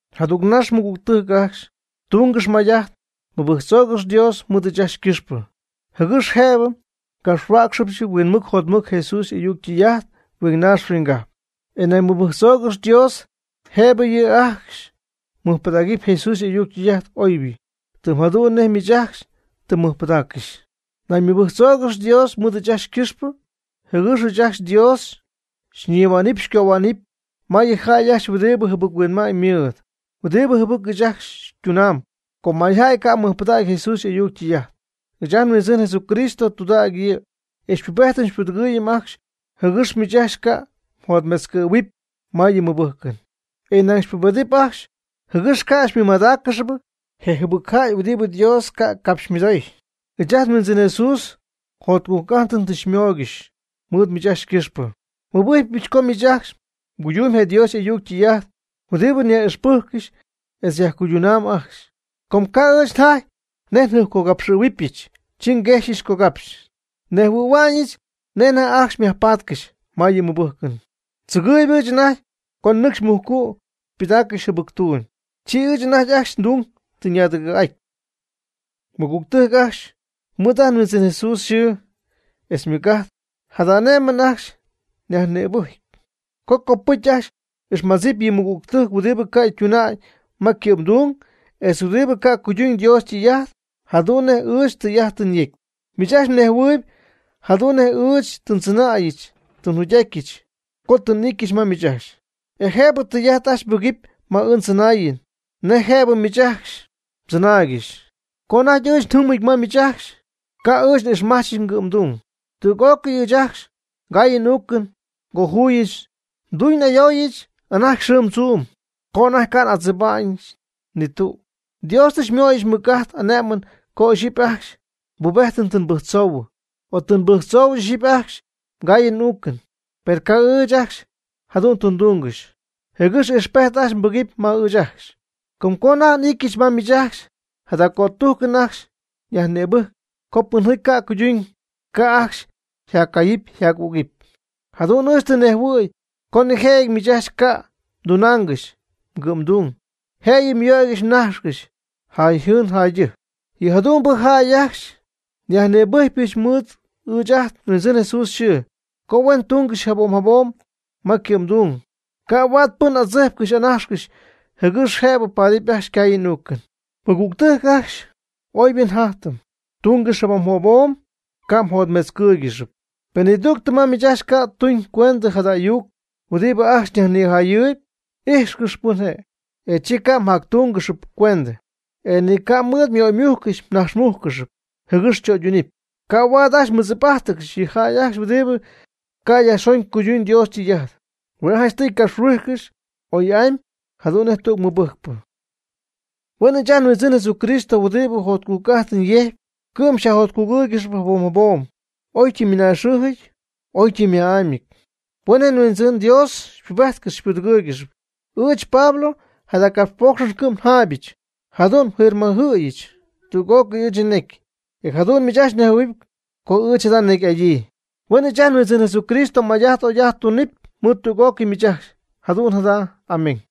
Jadügnax, mɨgügtɨjc ajcxy, tungɨx may'ajt mɨbɨjctzoogɨx Dios mɨɨd ɨɨch ajcxy ycɨxpɨ, jɨgɨx jëbɨ ngapxhuäcxɨbɨch huinmɨc jotmɨc Jesús y'ayuc ytɨy'ajt huingnaax huinggajp. E nañ mɨbɨjctzoogɨx Dios jëbɨ yɨ jäy ajcxy mɨjpɨdägɨpy Jesús y'ayuc ytɨy'ajt oybɨ, tɨm jadu'n nej miich ajcxy tɨ mmɨjpɨdaaccɨxy. Nañ mɨbɨjctzoogɨx Dios mɨɨd ɨɨch ajcxy ycɨxpɨ, jɨgɨx ɨɨch ajcxy Dios xyñihua'nɨpy xycohua'nɨpy ma yɨ jäy ajcxy huɨdibɨ jɨbɨc-huinma'ñ ymɨɨd, huɨdibɨ jɨbɨc ɨɨch ajcxy xytunamb, com mayjäy ca' mɨjpɨdägy Jesús y'ayuc ytɨy'ajt. Ɨɨch ajt nHuindzɨn Jesúcristo tudägy yɨ', e xypubedɨp xypudɨgɨ̈huɨp ajcxy jɨgɨx miich ajcxy ca' mjotmetzcɨ̈huɨpy ma yɨ mmɨbɨjcɨn, e nañ xypubedɨp ajcxy, jɨgɨx ca' xymɨmadáaccɨxɨpy je jɨbɨcjäy huɨdibɨ Dios ca' capxymɨdoy. Ɨɨch ajt nHuindzɨn Jesús jotcujc'ajtɨn tɨ xymóoygɨxyɨch mɨɨd miich ajcxy ycɨxpɨ. Nmɨbɨjcpyɨch co miich ajcxy mguydumyb je Dios y'ayuc ytɨy'ajt huɨdibɨ nyaj'ixpɨjccɨxy etz mjaccuydunaamyb ajcxy. Com ca' ɨɨch njaty nej njɨjpcogapxɨ̈huɨbɨch, chi nguejxyɨch cogapxy, nnejhuɨ̈hua'ñɨch nej anajty ajcxy myajpatcɨxy ma yɨ mɨbɨjcɨn, tzɨgɨɨyb ɨɨch anajty co nɨcxy mujcu' xypɨdaaccɨxy jɨbɨctuum, chi ɨɨch anajty ajcxy ndung tɨ ñaadɨgɨ̈'aty. Mɨgügtɨjc ajcxy, mɨɨd ajt nHuindzɨn Jesús yxɨɨ etz ymɨc'ajt jada ane'mɨn ajcxy nyajnïbɨjcpy, co copɨcy ajcxy m'ixmadzɨpy yɨ mmɨgüg huɨdibɨ ca' ytuna'ñ ma ycɨ'mdung, etz huɨdibɨ ca' cuyduñ Dios ytɨy'ajt jadu'n nej ɨɨch tɨy'ajt tɨ nyecy. Miich ajcxy mnejhuɨɨyb jadu'n nej ɨɨch tɨ ndzɨnäyɨch tɨ njugy'atyɨch co tɨ n'ityɨch ma miich ajcxy. E jëbɨ tɨy'ajt ajcxy mbɨgɨpy ma ɨɨch ndzɨnaayɨn nej jëbɨ miich ajcxy mdzɨnaaygɨxy. Co anajty ɨɨch njɨmɨty ma miich ajcxy, ca' ɨɨch n'ixmajch ngɨ'mdung. Tüg'ócɨy ɨɨch ajcxy ngaayɨn n'uucɨn ngojuuyɨch. Nduñ n'ayooyɨch anajty xɨɨm tzuum, co anajty ca' n'adzɨba'ñɨch ni tüg. Dios tɨ xymöyɨch mɨc'ajt ane'mɨn co ixyipy ajcxy mbubejtɨn tɨ nbɨjctzoohuɨ o tɨ nbɨjctzoohuɨ ixyipy ajcxy mgaayɨn m'uucɨn, per ca' ɨɨch ajcxy jadu'n tɨ ndúngɨxyɨch, jɨgɨx ijxpejt ajcxy mbɨgɨpy ma ɨɨch ajcxy. Com co anajty n'ityɨch ma miich ajcxy jada cötujcɨn ajcxy nyajnïbɨjc co pɨnjaty ca' ytuna'ñ, ca' ajcxy myajcayɨpy myaj'ügɨpy. Jadu'n ɨɨch tɨ nnejhuɨ̈y co nijëjɨty miich ajcxy ca' mdunaangɨxy mgɨ'mdung, jëyɨ myöygɨxy mnajxcɨxy jäyjɨɨn jäydɨjc. Yɨ jadu'mbɨ jäy ajcxy nyajnïbɨjcpyɨch mɨɨd ɨɨch ajt nHuindzɨn Jesús yxɨɨ co huen tungɨxy jabom jabom ma ycɨ'mdung, ca' huaad pɨn adzijpcɨx anajxcɨx jɨgɨx jëbɨ paadɨp ajcxy ycaayɨn y'uucɨn. Mɨgügtɨjc ajcxy, oybɨ jatyɨm tungɨxy jabom jabom, ca' mjotmetzcɨ́ɨygɨxɨpy. Pen nidügtɨ ma miich ajcxy ca' tuñ cuendɨ jada ayuc huɨdibɨ ajcxy nyajnijayɨɨyb, ijxcɨx pɨn je', e chi ca' mjactúngɨxɨp cuendɨ, e ni ca' mɨɨd myöymujc mnaxmújcɨxɨpy, jɨgɨx chöydunɨpy. Ca' ajcxy huaad mɨdzip'ajtcɨxy yɨ jäy ajcxy huɨdibɨ ca' yajxon cuyduñ Dios ytɨy'ajt. Hue' janchtɨy mgapxhuijcɨx oy'amy jadu'n nej tüg mɨbɨjcpɨ. Huen ɨɨch ajt nHuindzɨn Jesucristo huɨdibɨ jotcujc'ajtɨn yejcp, cɨ'm xyajjotcugɨ́ɨygɨxɨpy jabom jabom oytɨm mɨnaaxɨɨjɨty oytɨm yma'ámyɨty. Huen je Huindzɨn Dios xypubejtcɨxy xypudɨgɨɨygɨxy. Ɨɨch, Pablo, jada capxpoocxɨn cɨ'm njaayɨch. Jadu'n nfirmajɨ̈yɨch tüg'ócɨy ɨɨch nnecy, e jadu'n miich ajcxy mnejhuɨ̈huɨpy co ɨɨch jada necy'adyii. Huen ɨɨch ajt nHuindzɨn Jesucristo may'ajt oy'ajt tunɨpy mɨɨd tüg'ócɨy miich ajcxy. Jadu'n jada. Amén.